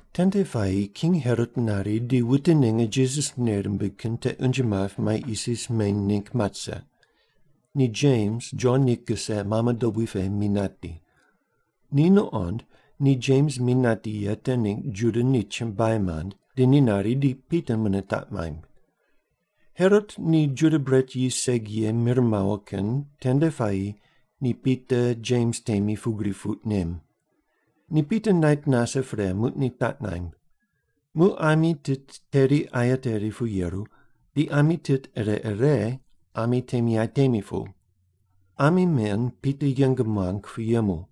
Tende puayi King Herot nari di wute ninge Jisas nei rimbig kin te unje map mai isis meny ningg mat rise. Ni Jems Jon ni kise mame dobui pe mi nati. Ni nuqond ni Jems mi nati ye te ningg Juda ni chumbuai mand, di ni nari di Pita mune taq maimb. Herot ni Juda bret yis segi ye mir mawo kin tende puayi ni Pita Jems temi pugri puq nem. Ni Pita nait nase pre, muq ni taq naimb. Muq ami tit teri aye teri pu yeru, di ami tit ire ire ami temi aye temi pu. Ami men Pita yeng muang pu yemu.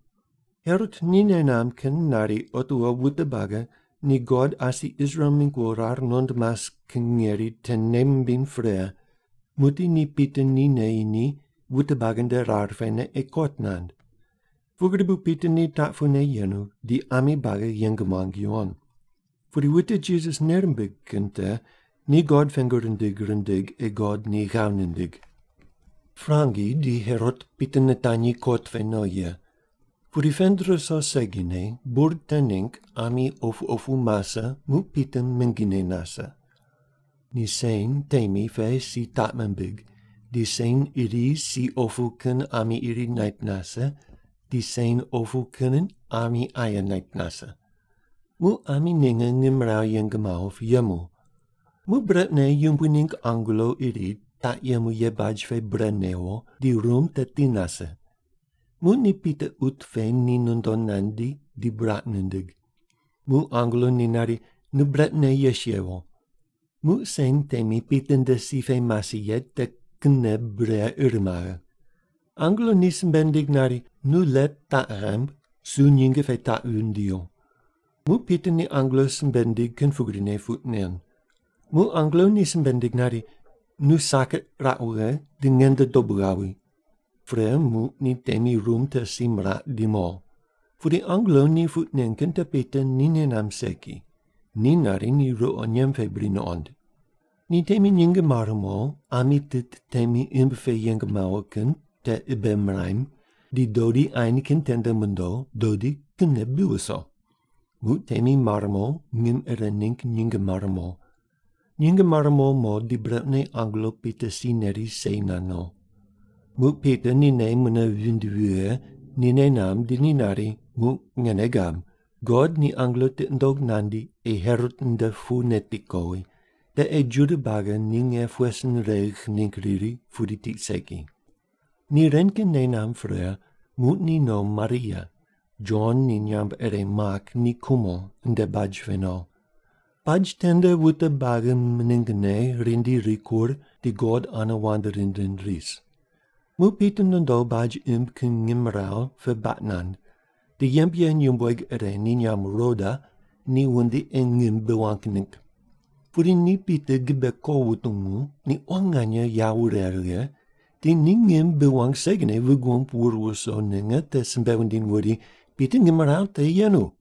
Herot ni nei namb kin nari otiwo wute buagi ni God asi Israel mingg wo rar nuqond mas kin ngeri te nei mimbiny pre, muqdi ni Pita ni neyi ni wute buagi nde rar pene ei kot nand. Pugri bu Pita ni taq pune yenu di ami buagi yeng muang yuwon. Pudi wute Jisas nei rimbig kin te ni God pengu rindig rindig ei God ni ghav nindig. Prangi di Herot Pita nitanyi kot pe no ye. Pudi pend ruso segine, bur te ningg ami opu opu mase muq Pita mingine nase. Ni sen temi pe si taq mimbig, di sen iri si opu kin ami iri nait nase, di sen opu kin ami aye nait nase. Muq ami ninge ngimrawu yeng mawo pu yemu. Muq brequne Yumbui ningg angelo iri taq yemu ye baj pe bre newo, di rum te ti nase. Muq ni Pita ut pe ni nondo nandi di buraq nindig. Muq angelo ni nari, “Nu brequne yes yewo.” Muq sen temi Pita nde si pe mase ye te kinne bure ir maghe. Angelo ni simbe nindig nari, “Nu let taq ghaimb, su nyinge pe taq wundio.” Muq Pita ni angelo simbe nindig kin pugrine puq nen. Muq angelo ni simbe nindig nari, “Nu saket raq wughe, di nge nde dobu ghawi.” Pre muq ni temi rum te si miraq di mo. Pudi angelo te puq nen kin te Pita ni nei namb segi, ni nari ni ruqo nyemb pe bri nuqond. Ni temi nyinge mare mo, ami tit temi imb pe yeng mawo kin te ibe miram, di dodi ain kin tende mondo, dodi kinne bi wuso. Muq temi mar mo, ngim ire ningg nyinge mare mo. Nyinge mare mo mo di brequne angelo Pita si neri sei nand no. Muq Pita ni nei mune vinde vighe, ni nei namb, di ni nari, “Muq nge nei gab. God ni angelo tiqi nundog nandi ei Herot nde pu neti kowi, te ei Juda buagi ni nge pughe sin regh ningg riri pudi tiq segi.” Ni ren kin nei namb pre muq ni no Maria, Jon ni nyamb ire Mak ni kumo nde baj pe no. Baj tende wute buagi miningne rindi rikur di God ane wand rind rind ris. Muq Pita nondo baj imb kin ngimrawu pe baq nand, di yembe ye nyumbueg ire ni nyamb Roda ni wundi ei ngim bi wang ningg. Pudi ni Pita gibe ko wutungu, ni quan nganye yawo wure righe, di ni ngim bi wang segine vig wumb wur wuso ninge te simbe wundiny wuri, “Pita ngimrawu te yenu!”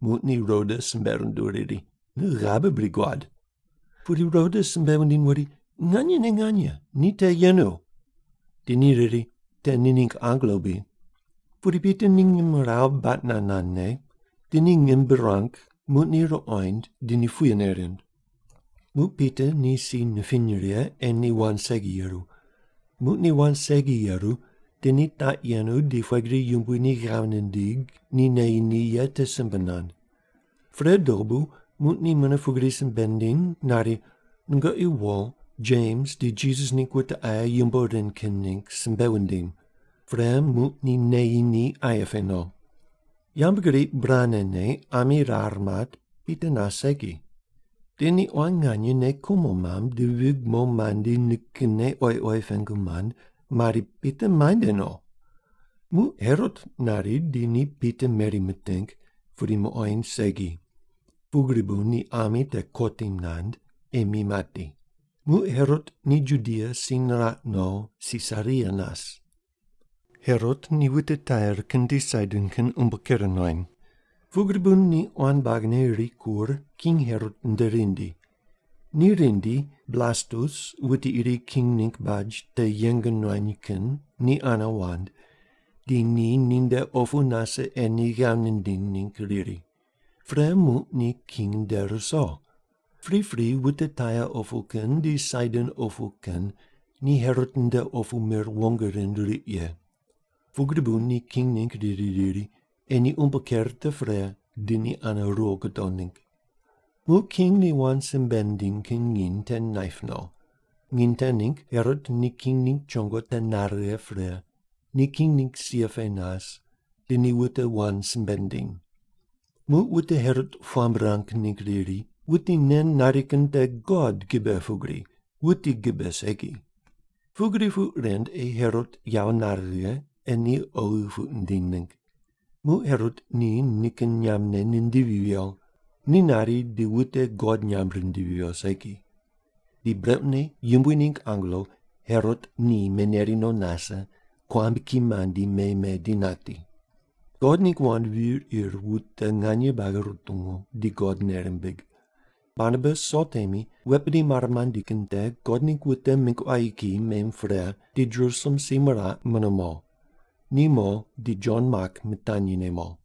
Muq ni Roda simbe runduw riri, “Nu ghabe bri guad?” Pudi Roda simbe wundiny wuri, “Nganyene nganye, ni te yenu.” Di ni riri, “Te ni ningg angelo bri?” Pudi Pita ni ngimrawu baq nand nandne, di ni ngim bi ruang, muq ni ruqoind di ni puyene rind. Muq Pita ni si nipiny righe ei ni wand segi yeru. Muq ni wand segi yeru di ni taq yenu di pughe gri Yumbui ni ghav nindig ni neyi ni ye te simbe nand. Pre dobu muq ni mune pugri simbe nindiny nari, “Nungoqi wo, Jems di Jisas ningg wute aye yumbo ren kin ningg simbe wundim.” Pre, muq ni neyi ni aye pe no. Yambgriq burane ne ami rar mat, Pita nas segi. Di ni quan nganye nei kumo mamb di vig mo mandi nikinne oyi oyi pengu mand mari, “Pita muainde no?” Muq Herot nari di ni Pita meri miting, pudi muqoind segi. Pugri bu ni ami te kotim nand, ei mi mati. Muq Herot ni Judia si niraq no, Sisaria nas. Herot ni wute Tair kin di Saidon kin umbo ker nuany. Pugri bu ni quan buagine rikur King Herot nde rindi. Ni rindi, Blastus wuti iri king ningg baj te yeng nuany kin ni ane wand, di ni ninde opu nase ei ni ghav nindiny ningg riri. Pre muq ni king nde ruso. Pripri wute Tair opu kin di Saidon opu kin ni Herot nde opu mir wong rind riq ye. Pugri bu ni king ningg riri riri, ei ni umbo ker te pre di ni ane ruwo gudo ningg. Muq king ni wand simbe nindiny kin nginy te naip no. Nginy te ningg Herot ni king ningg chongo te nare righe pre, ni king ningg sia pe nas, di ni wute wand simbe nindiny. Muq wute Herot puamb ruang ningg riri, “Wuti nen nari kin te god gibe pugri, wuti gibe segi!” Pugri puq rind ei Herot yawo nare righe ei ni oghi puq nindiny ningg. Muq Herot ni nikin nyambne nindivi viyo. Ni nari di wute God nyamb rindivi viyo segi. Di brequne Yumbui ningg angelo Herot ni meneri no nase, kuambki mandi me me di nati. God ningg wand vir ir wute nganye buagi rutungu di God nei rimbig. Barnabas Sol temi wet bidi mare mandi kin te God ningg wute mingg quayi kiyi mem pre di Jerusalem si miraq mune mo. Ni mo di Jon Mak mitanyi ne mo.